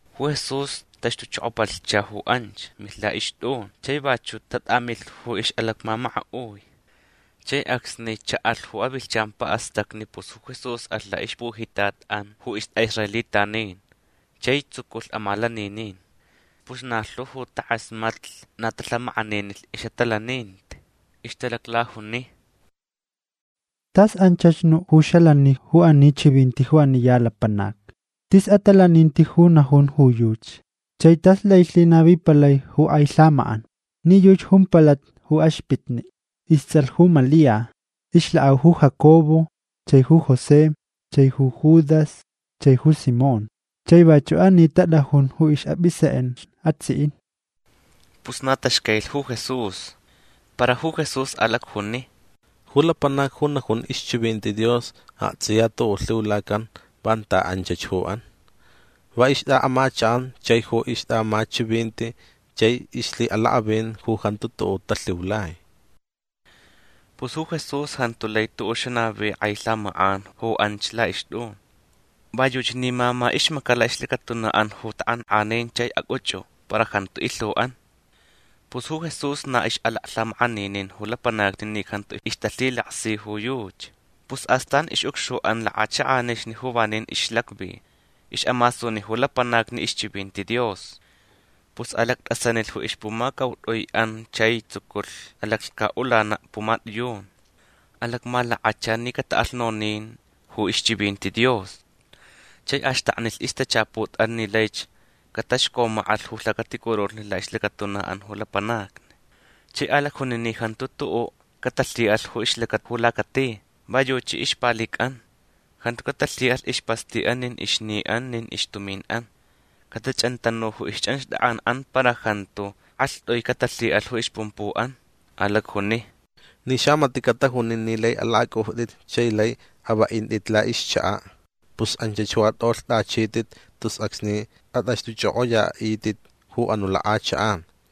Ju Jesús taxtuchokopalhcha ju anch. Milh la'ixt'un. Chai vachu' tat'amilh ju ix'alacmamaka'ui. Chai acsni cha'alh ju avilhchan pa'astacni pus ju Jesús alh la'ixpujitat'an ju ist'a'israelitanin chai tsuculh amalaninin. Pus na lhu ju tak'asmatlh na talhamak'aninilh ix'atalaninti. Ixtalaclajuni: ―Tas anchach nu' ju xalani ju ani chivinti ju ani ya lapanac. Tis atalaninti ju najun ju yuchi. Chai tas lai lhinavipalai ju k'ai lhamak'an. Ni yuchi jumpalata ju axpitni'. Ists'alh ju Malia. Ixlak'au ju Jacobo chai ju José chai ju Judas chai ju Simón. Chai vachu' ani tat'ajun ju ix'ap'isek'ench atsi'in. Pus na taxcailich ju Jesús. Para ju Jesús alacjuni: ―Ju lapanac ju najun ixchivinti Dios akts'iya tu'u' lhiulacan vanta anchach ju an. Va ixt'a'amachak'an chai ju ixt'a'amachivinti chai ixlhi'alak'avin ju jantu tu'u' talhiulai. Pus ju Jesús jantu lai tu'u' xanavi k'ai lhamak'an ju anch la'ixt'un. Va yuchi ni mama ixmaca' la'ixlacatuna'an ju tak'ank'anin chai ac'uch'u. Para jantu ilhu'an. Pus ju Jesús na ix'alaklhamak'aninin ju lapanacni ni jantu ixtalhilaksi ju yuchi. Pus astan ix'ucxu'an lak'achak'anixni ju vanin ixlacvi. Ix'amasuni ju lapanacni ixchivinti Dios. Pus alact'asanilh ju ixpumacaut'ui'an chai tsuculh alaclhca'ulana' pumat'iyun. Alacmalakacha ni cata'alh nonin ju ixchivinti Dios. Chai axtaknilh ixtachaput'an ni laich cataxcomak'alh ju lhacaticurulhni la'ixlacatuna'an ju lapanacni. Chai alacjuni ni jantu tu'u' catalhi'alh ju ixlacata ju lacati. Va yuchi ixpalic'an. Jantu catalhi'alh ispasti'an nin ixni'an nin ixtumin'an. Catach'antanu ju ixch'anxt'ak'an'an para jantu k'alht'ui catalhi'alh ju ixpumpu'an. Alacjuni: ―Ni xamati' catajunan ni lai alak'ac'ujt'it chai lai avenat'it la'ixchaka' pus anchach ju at'olht'achit'it tus acsni at'axt'uch'ok'oya'it'it ju anu' lak'achak'an.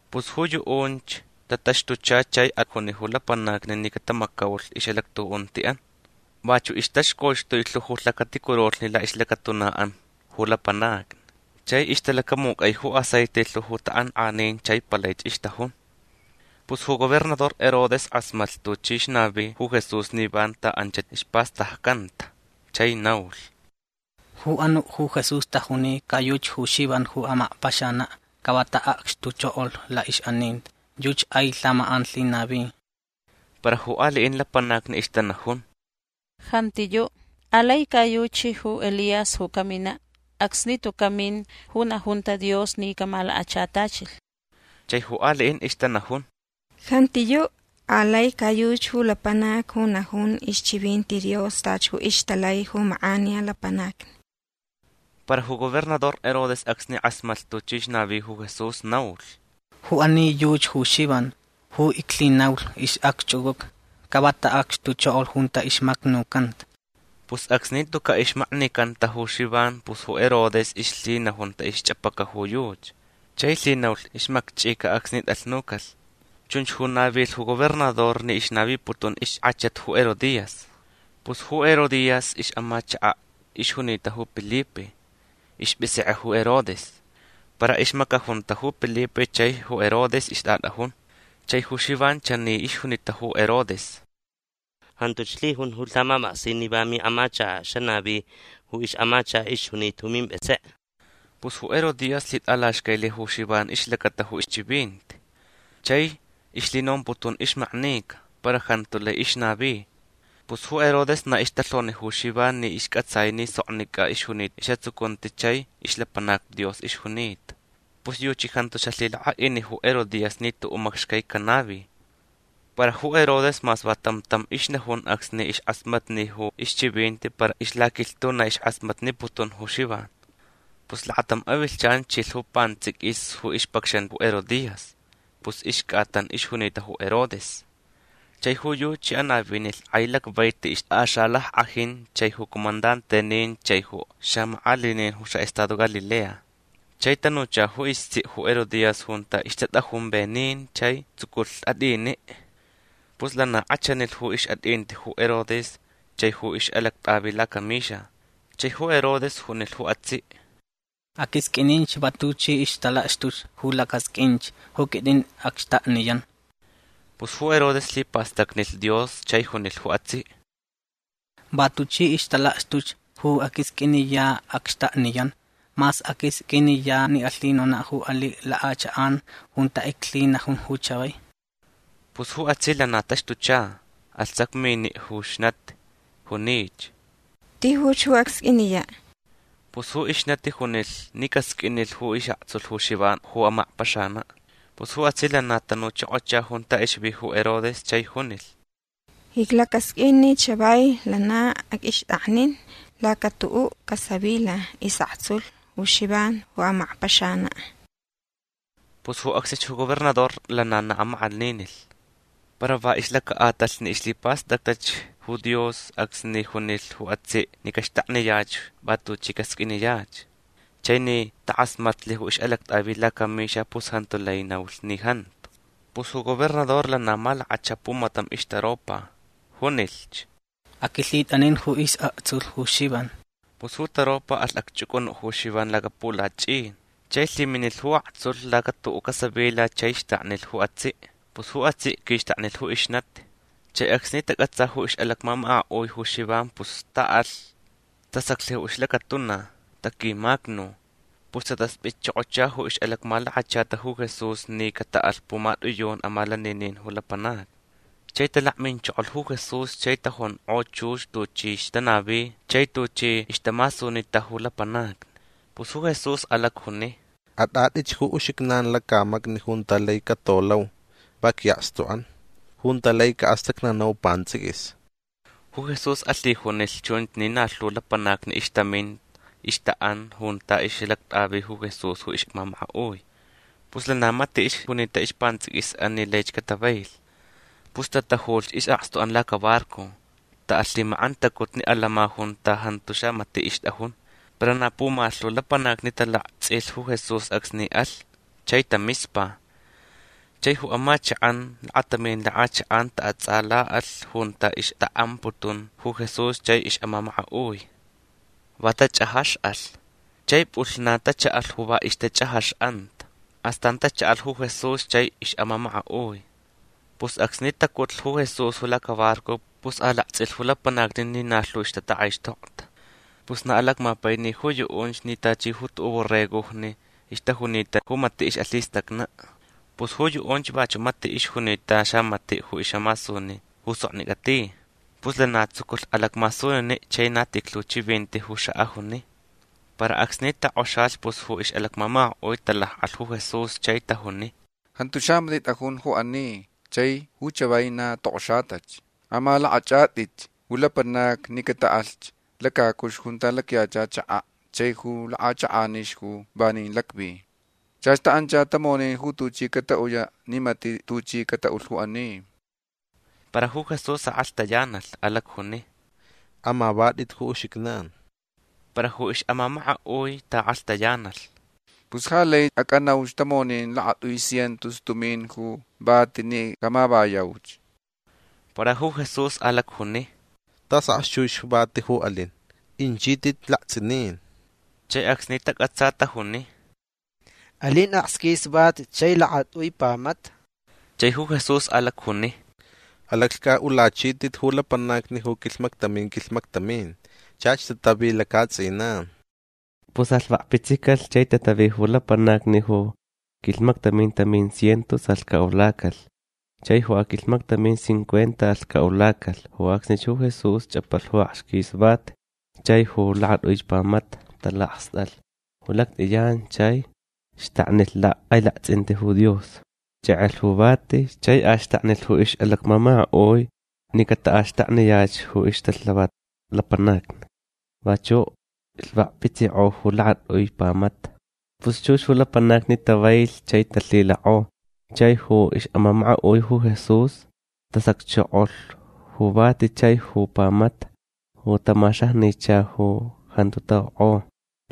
Pus ju yu'unch tataxtucha chai ajuni ju lapanacni ni catamacaulh ix'alactu'unti'an. Vachu' ixtaxcoxtui lhu ju lhacaticurulhni la'ixlacatuna'an ju lapanacni. Chai ixtalacamuc'ai ju aceite lhu ju tak'ank'anin chai palaich ixtajun. Pus ju gobernador Herodes k'asmatlh tuchi ixnavi ju Jesús ni vanta anchach ispastaccanta. Chai naulh: ―Ju anu' ju Jesús tajuni ca yuchi ju Xivan ju amakpaxana'. Ca va ta'acxtuchokolh la'ix'aninti. Yuchi k'ai lhamak'an lhinavi. Para ju ali'in lapanacni ixtanajun: ―Jantiyu'. Alai ca yuchi ju Elías ju camina' acsni tuca' min ju najunta Dios ni camalakachatachilh. Chai ju ali'in ixtanajun: ―Jantiyu'. Alai ca yuchi ju lapanac ju najun ixchivinti Dios tachi ju ixtalai ju mak'aniya lapanacni. Para ju gobernador Herodes acsni k'asmatlh tuchi ixnavi ju Jesús naulh: ―Ju ani yuchi ju Xivan ju iclhinaulh ix'acch'uc'uca. Ca va ta'acxtuchokolh junta ixmacnucanta. Pus acsni tuca' ixmaknicanta ju Xivan pus ju Herodes ixlhinajunta ixch'ap'aca ju yuchi. Chai lhinaulh ixmakch'ica acsni t'alhnucalh. Chunch ju navilh ju gobernador ni ixnaviniputun ixk'achat ju Herodías. Pus ju Herodías ix'amachaka' ixjunita ju Pilipe. Isp'isek'e ju Herodes. Para ixmacajunta ju Pilipe chai ju Herodes ixt'at'ajun. Chai ju Xivan chani ixjunita ju Herodes: ―Jantuch lhijun ju lhamap'aksin ni va mi'amachaka' xanavi ju ix'amachaka' ixjunita ju mimp'isek'e. Pus ju Herodías lhit'alaxcailh ju Xivan ixlacata ju ixchivinti. Chai ixlhinomputun ixmaknica. Para jantu lai ixnavi. Pus ju Herodes na ixtalhoni ju Xivan ni isc'atsai ni soknic'a ixjunita is'atsucunti chai ixlapanac Dios ixjunita. Pus yuchi jantu xalhilak'a'ini ju Herodías ni tu'u' macxcai canavi. Para ju Herodes mas va tam tam ixnajun acsni ixk'asmatni ju ixchivinti para ixlaquilhtu na ixk'asmatniputun ju Xivan. Pus lakatam avilhchan chilh ju pants'iquis ju ixpacxan ju Herodías. Pus ixc'atan ixjunita ju Herodes. Chai ju yuchi anavinilh k'ai lacvaiti ixt'axalack'ajin chai ju comandantenin chai ju xamak'alinin ju xa'estado Galilea. Chai tanucha ju istsi' ju Herodías junta ixtat'ajun venin chai tsuculh at'ini'. Pus lana k'achanilh ju ix'at'inti ju Herodes chai ju ix'alact'avi lacamixa. Chai ju Herodes junilh ju atsi': ―Aq'uisq'uininch va tuchi ixtalakxtuch ju lac'asq'uinch. Ju quit'in acxtakniyan. Pus ju Herodes lhipastacnilh Dios chai junilh ju atsi': ―Va tuchi ixtalakxtuch ju aq'uisq'uiniya' acxtakniyan mas aq'uisq'uiniya' ni alhinona' ju ali' lak'achak'an junta iclhinajun ju chavai. Pus ju atsi' lana taxtucha. Alh sacmini' ju ixnati. Junich: ―Tijuch ju acsq'uiniya'. Pus ju ixnati junilh ni casq'uinilh ju is'aktsulh ju Xivan ju amakpaxana'. Pus ju atsi' lana tanuchokocha junta ixvi ju Herodes chai junilh: ―Iclacasq'uin ni chavai lana aq'uixt'aknin lacatu'u' casavila is'aktsulh ju Xivan ju amakpaxana'. Pus ju acsnich ju gobernador lana na amak'aninilh. Para va ixlaca'atalh ni ixlhipastactach ju Dios acsni junilh ju atsi' ni caxtakniyach va tuchi casq'uiniyach chai ni tak'asmatlh ju ix'alact'avi lacamixa pus jantu lai naulh ni jantu. Pus ju gobernador lana malakachalh pumatam ixtaropa. Junilhch: ―Aq'uilhit'anin ju is'aktsulh ju Xivan. Pus ju taropa alh acch'uc'unu' ju Xivan lacapulach'in. Chai lhiminilh ju aktsulh lacatu'u' casavila chai xtaknilh ju atsi'. Pus ju atsi' quixtaknilh ju ixnati. Chai acsni tac'atsa ju ix'alacmamaka'ui ju Xivan pus ta'alh. Tasaclh ju ixlacatuna. Taquimacnu. Pus tatasp'itchokocha ju ix'alacmalakachata ju Jesús ni cata'alh pumat'iyun amalaninin ju lapanacni. Chai talakminchokolh ju Jesús chai tajunk'o chux tuchi ixtanavi chai tuchi ixtamasunita ju lapanacni. Pus ju Jesús alacjuni: ―At'at'itch ju uxijnan lacamacni junta lai catolauch va qui'akstu'an. Junta lai ca'astacnanau pants'iquis. Ju Jesús alhijunilh chunch ni na lhu lapanacni ixtamin ixta'an junta ix'alact'avi ju Jesús ju ix'amamaka'ui. Pus lana mati' ixjunita ispants'iquis'an ni lai catavailh. Pus tatajulh is'akstu'an lacabarco. Ta'alh lhimak'antacutni atants'in junta jantu xamati' ixt'ajun. Para na pumalhu lapanacni talakts'ilh ju Jesús acsni alh. Chai tamispa. Chai ju amachak'an lakatamin lak'achak'an ta'ats'ala'alh junta ixta'amputun ju Jesús chai ix'amamaka'ui. Va tach'ajax'alh. Chai p'ulhnan tacha'alh ju va ixtach'ajax'anta. Astan tacha'alh ju Jesús chai ix'amamaka'ui. Pus acsni tacutlh ju Jesús ju lacabarco pus alakts'ilh ju lapanacni ni na lhu ixtatak'aixtokta. Pus na alacmapaini ju yu'unch ni tachi ju tu'u' borregojni ixtajunita ju mati' ix'alhistacna'. Pus ju yu'unch vachu' mati' ixjunita xamati' ju ix'amasuni ju soknic'a ti. Pus lana tsuculh alacmasunini' chai na tijlhu chivinti ju xa'ajuni. Para acsni tok'oxalh pus ju ix'alacmamaka'ui talak'alh ju Jesús chai tajuni: ―Jantu xamati' t'ajun ju ani chai ju chavai na tok'oxatach. Amalak'ach'at'ich ju lapanacni ni cata'alh lacacuxtu junta lacyacha chaka' chai ju lak'achak'anixni ju vanin lacvi. Chach ta'ancha tamonin ju tuchi cata'uyach ni mati' tuchi cata'ulh ju ani. Para ju Jesús ak'alhtayanalh. Alacjuni: ―Amavat'it ju uxijnan. Para ju ix'amamaka'ui ta'ak'alhtayanalh: ―Pus ja lai ac'anauch tamonin lakat'ui cientos tumin ju vati ni camavayauch. Para ju Jesús alacjuni: ―Tas akxchux vati ju alin. Inchit'it lakts'inin. Chai acsni tac'atsa tajuni: ―Alin akxquis vati chai lakat'ui pamata. Chai ju Jesús alacjuni: ―Alaclhc'a'ulachit'it ju lapanacni ju quilhmactamin quilhmactamin. Chach tatavi laca'ats'inan. Pus alhvakpitsicalh chai tatavi ju lapanacni. Ju quilhmactamin tamin cientos alhca'ulacalh. Chai ju aquilhmactamin cincuenta alhca'ulacalh. Ju acsnich ju Jesús ch'apalh ju akxquis vati chai ju lakat'uich pamata. Talakst'alh ju lact'iyan chai xtaknilh lhak'ailakts'inti ju Dios. Ch'ek'elh ju vati. Chai axtaknilh ju ix'alacmamaka'ui ni cata'axtakniyach ju ixtalhavat lapanacni. Vachu' lhvakpitsik'o ju lakat'ui pamata. Pus chux ju lapanacni tavailh chai talhilak'o. Chai ju ix'amamaka'ui ju Jesús tasacchokolh ju vati chai ju pamata ju tamaxajnicha ju jantu ta'ok'o.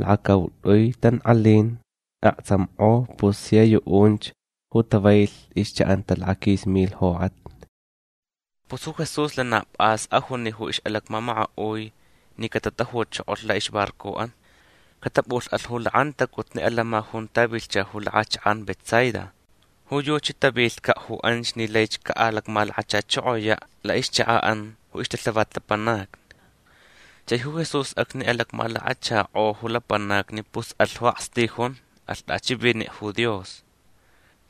Lakacaut'ui tank'alin aktsamk'o. Pus sia yu'unch ju tavailh ixcha'anta lakaquis milh jok'atni. Pus ju Jesús lana p'as ajuni ju ix'alacmamaka'ui ni catatajuchokolh la'ixbarco'an. Catap'ulh'alh ju lak'antacutni atants'in junta vilhcha ju lak'achak'an Betsaida. Ju yuchi tavilhca' ju anch ni laich ca'alacmalakachachokoya' la'ixchaka'an ju ixtalhavat lapanacni. Chai ju Jesús acsni alacmalakachak'o ju lapanacni pus alh ju akstijun. Alh t'achivini' ju Dios.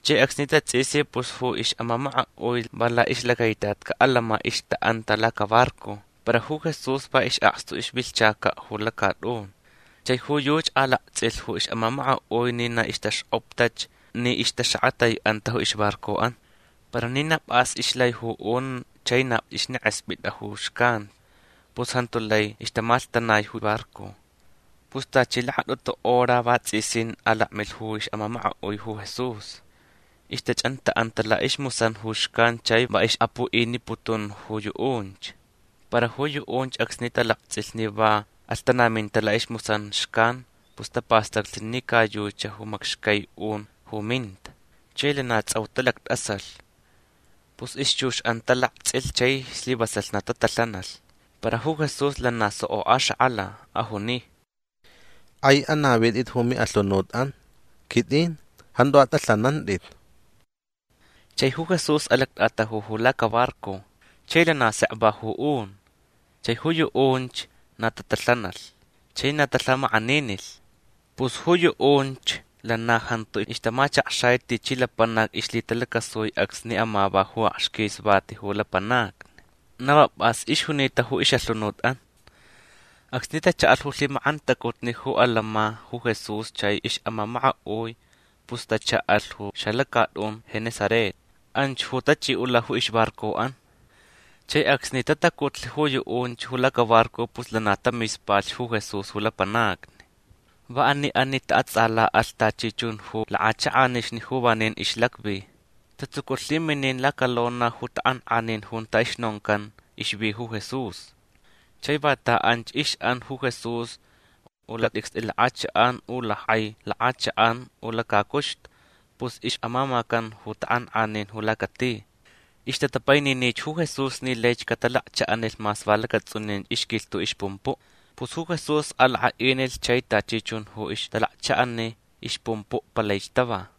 Chai acsni tats'isi pus ju ix'amamaka'ui va la'ixlacaitatca' atants'in ixta'anta lacabarco. Para ju Jesús va is'akstu ixvilhchaca' ju lacat'un. Chai ju yuchi alakts'ilh ju ix'amamaka'ui ni na ixtaxk'optach ni ixtaxakatai'anta ju ixbarco'an. Para ni na p'as ixlai ju un chai na ixnek'esp'it'a ju xcan pus jantu lai ixtamalhtanai ju barco. Pus tachi lakat'utu hora vats'isin alakmilh ju ix'amamaka'ui ju Jesús. Ixtach'anta'anta la'ismusan ju xcan chai va ix'apu'iniputun ju yu'unch. Para ju yu'unch acsni talakts'ilh ni va alhtanaminta la'ismusan xcan pus tapastaclh ni ca yuchi ju macxcai un ju minta. Chai lana ts'au talact'asalh. Pus ixchux'an talakts'ilh chai slivasalh na tatalhanalh. Para ju Jesús lana soko axak'ala. Ajuni: ―K'ai anavit'it ju mi'alhunut'an. Quit'in. Jantu at'alhanant'it. Chai ju Jesús alact'ataju ju lacabarco. Chai lana sek va ju un. Chai ju yu'unch na tatalhanalh chai na talhamak'aninilh. Pus ju yu'unch lana jantu ixtamachakxai tichi lapanac ixlhitalacasui acsni amava ju akxquis vati ju lapanacni. Na va p'as ixjunita ju ix'alhunut'an. Acsni tacha'alh ju lhimak'antacutni ju atants'in ju Jesús chai ix'amamaka'ui pus tacha'alh ju xalacat'un Genesaret. Anch ju tach'i'ula ju ixbarco'an. Chai acsni tatacutlh ju yu'unch ju lacabarco pus lana tamispalhch ju Jesús ju lapanacni. Va ani ani ta'ats'ala'alh tachi chun ju lak'achak'anixni ju vanin ixlacvi. Tatsuculh lhiminin lacalona ju tak'ank'anin junta ixnoncan ixvi ju Jesús. Chai vanta anch ix'an ju Jesús u lacat'icst'i lak'achak'an u lack'ai lak'achak'an u lacacuxtu pus ix'amamacan ju tak'ank'anin ju lacati. Ixtatapaininich ju Jesús ni laich catalakcha'anilh mas va lacats'unin ixquilhtu' ixpumpu'. Pus ju Jesús alak'a'inilh chai tachi chun ju ixtalakcha'ani ixpumpu' palaich tava.